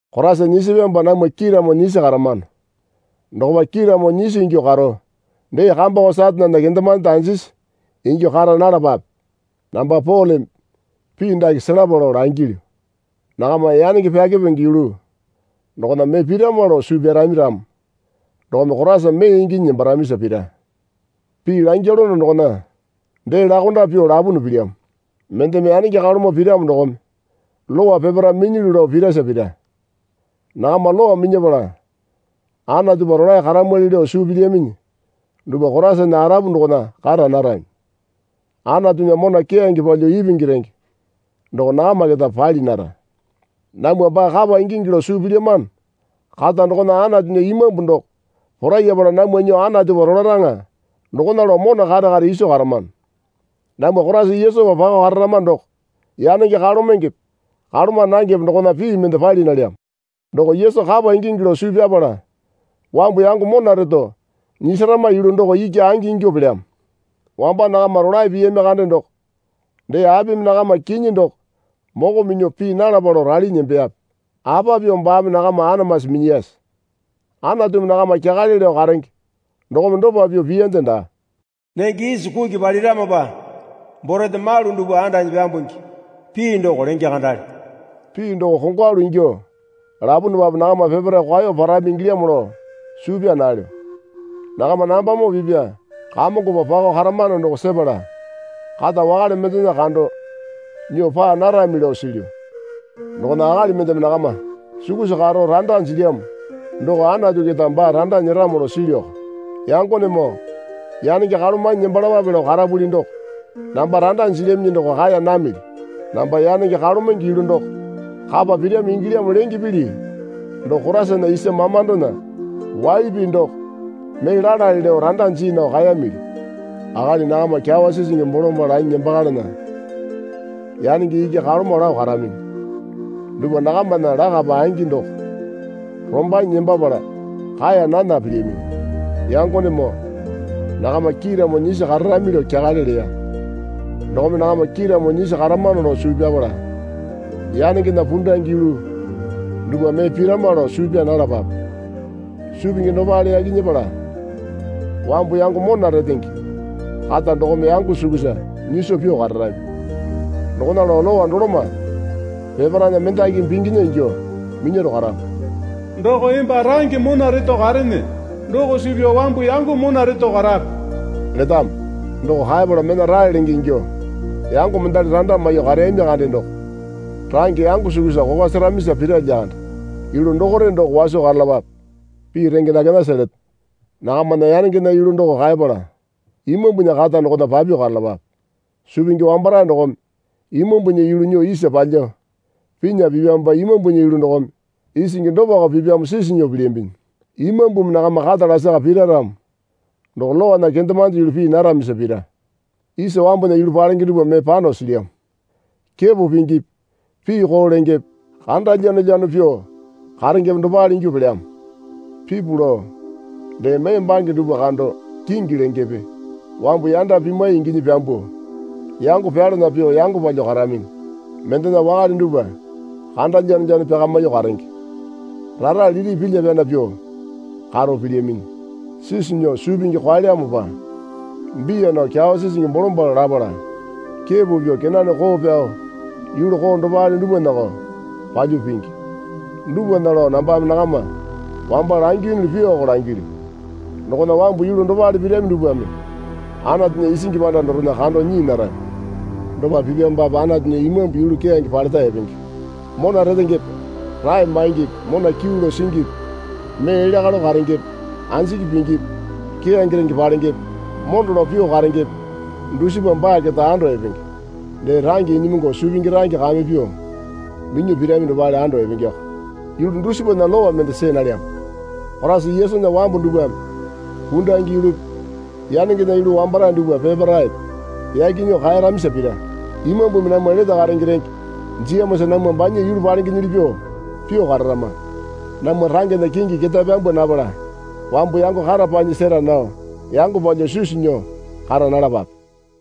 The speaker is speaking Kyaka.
Koraisa nyisipyamopa namwa kiiramo nyisi karamano dokopa kiiramo nyisi ingyuo karo dee kambako Satanena kendemande anjisi ingyuo kara nalapape. Namba Poleme pii dake selapa lao langilyu. Nakama yanenge pyakepenge yulu dokona mee pirama lao suu pyarami ramo dokome Koraisa mee inginyi nembaramisa pira. Pii langyalono dokona dee lakonda pyuo lapuna pilyamo. Mendeme yanenge kalomo piramo dokome Lowa peparae minyilyu lao pirasa pira. Nakama Lowa minyapala Anatupa rolae karamwali lao suu pilyaminyi dupwa Koraisana arapu dokona kara narami. Anatunya mona keyange palyuo ipingi renge doko nakama keta pali nara. Namwa baa kapa ingingi lao suu pilyamano kata dokona Anatunya Imambu doko porayapala namwa nyuo Anatupa rolaraŋa dokona lao mona kare kare iso karamano. Namwa Koraisa Yesupa pako kararama doko yanenge kalomengepe kaloma nangepe dokona pii mende pali nalyamo. Doko Yesu kapa ingingi lao suu pyapala wambu yango mona reto nyisarama yulu doko iki angi ingyuo pelyamo. Wamba nakama rolae piyami kande doko dee apimi nakama kinyi doko moko minyuo pii nalapa lao ralinyi nembeyape? Apa pyuo baame nakama anamasi minyiyase? Anatumi nakama kyakale lao karenge dokome dopa pyuo piyande daa. Nenge isi kuki paliramopa borete malu dupwa andanyi pyambungi pii doko lenge kandale. Pii doko kongwalu ingyuo lapunupape nakama peparae kwao parami ingilyamo lao suu pyaa nalyo. Nakama nambamoo pipya Kamongopa pako karamano doko sepala kata wakale mendena kando nyuo paa narami lao silyu. Dokona akali mendeme nakama sukusa karo randa jilyamo doko Anatu keta baa randa nyeramo lao silyuko. Yangonemoo yanenge kalomanyi nembalapape lao karapuli doko namba randa jilyaminyi doko kaeya namili. Namba yanenge kalomenge yulu doko kapa pirami ingilyamo lenge pili doko Koraisana isa mamandona waili pii doko mee lalale lao randa jii nao kaemili. Akali nakama kyawa sisingi bolombalo lanyi nembakalana yanenge iki kalomo lao karaminyi. Dupwa nakamana lakapa angi doko rombanyi nembapala kaeya nana pilyaminyi. Yangonemoo nakama kiiramo nyisi kararami lao kyakale leya. Dokome nakama kiiramo nyisi karamano lao suu pyapala yanengena pundange yulu dupwa mee pirama lao suu pyaa nalapape. Suu pingi dopale yaki nyepala wambu yango mona retenge kata dokome yango sukusa nyiso pyuo kararami. Dokona lao Lowa doloma peparaena mendakimi pinginya ingyuo minyaro karamo. Doko emba range mona reto karene doko suu pyao wambu yango mona reto karape letamo. Doko kaepala mena rae lenge ingyo yango mendali randa maiyuo kareyami kande doko range yango sukusa kokwa seramisa pira lyakande. Yulu dokore doko waso karalapape. Pii renge dakenasa leto. Nakamana yanengena yulu doko kaepala Imambunya kata dokona papyuo karalapape. Suu pingi wambarae dokome Imambunya yulu nyuo isa palyuo pinya pipyamopa Imambunya yulu dokome isingi dopako pipyamo sisi nyuo pilyambinyi. Imambumi nakama kata lasaka pira ramo doko Lowana kendemande yulu pii naramisa pira. Isa wambunya yulu palenge dupwa mee pano silyamo. Kepo pingipi pii koo lengepe kanda lyanolyano pyuo karengepe dopale ingyuo pelyamo. Pipu lao dee mee bange dupwa kando kingi lengepe wambu yanda pimwai inginyi pyambuo yango pyalana pyuo yango palyuo karaminyi. Mendena wakale dupwa kanda lyanolyano pyakamyuo karenge. Rara lili pilya pyana pyuo karo pilyaminyi. Sisu nyuo suu pingi kwaelyamopa biya nao kyawa sisingi bolombalo lapala kepo pyuo kenane koo pyao yulu koo dopale dupwanako palyuo pingi. Dupwana lao nambame nakama wamba langiyunuli pyuoko langilyu. Dokona wambu yulu dopale pirami dupwame Anatunya isingi panda dorena kando nyii narami. Dopa pipyamopape Anatunya Imambu yulu keyange paleta epenge. Mona retengepe rae maingipi mona kyuu lao singipi mee elya kalo karengepe anjiki pingipi keyange renge palengepe mondo lao pyuo karengepe dusipa baa keta ando epenge. Dee range inyimungu suu pingi range kame pyuo minyuo pirami dopale ando epengeko. Yulu dusipana lowa mende see nalyamo. Koraisa Yesunya wambu dupwame pundange yulupi yanengena yulu wambarae dupwa peparaepe yaki nyuo kaeramisa pira. Imambumi namwa lete karenge renge jiyamosa namwa banya yulu palengenyili pyuo pyuo kararama. Namwa rangena kingi ketae pyambwa napala wambu yango kata panyi sera nao yango palyuo sisu nyuo kara nalapape.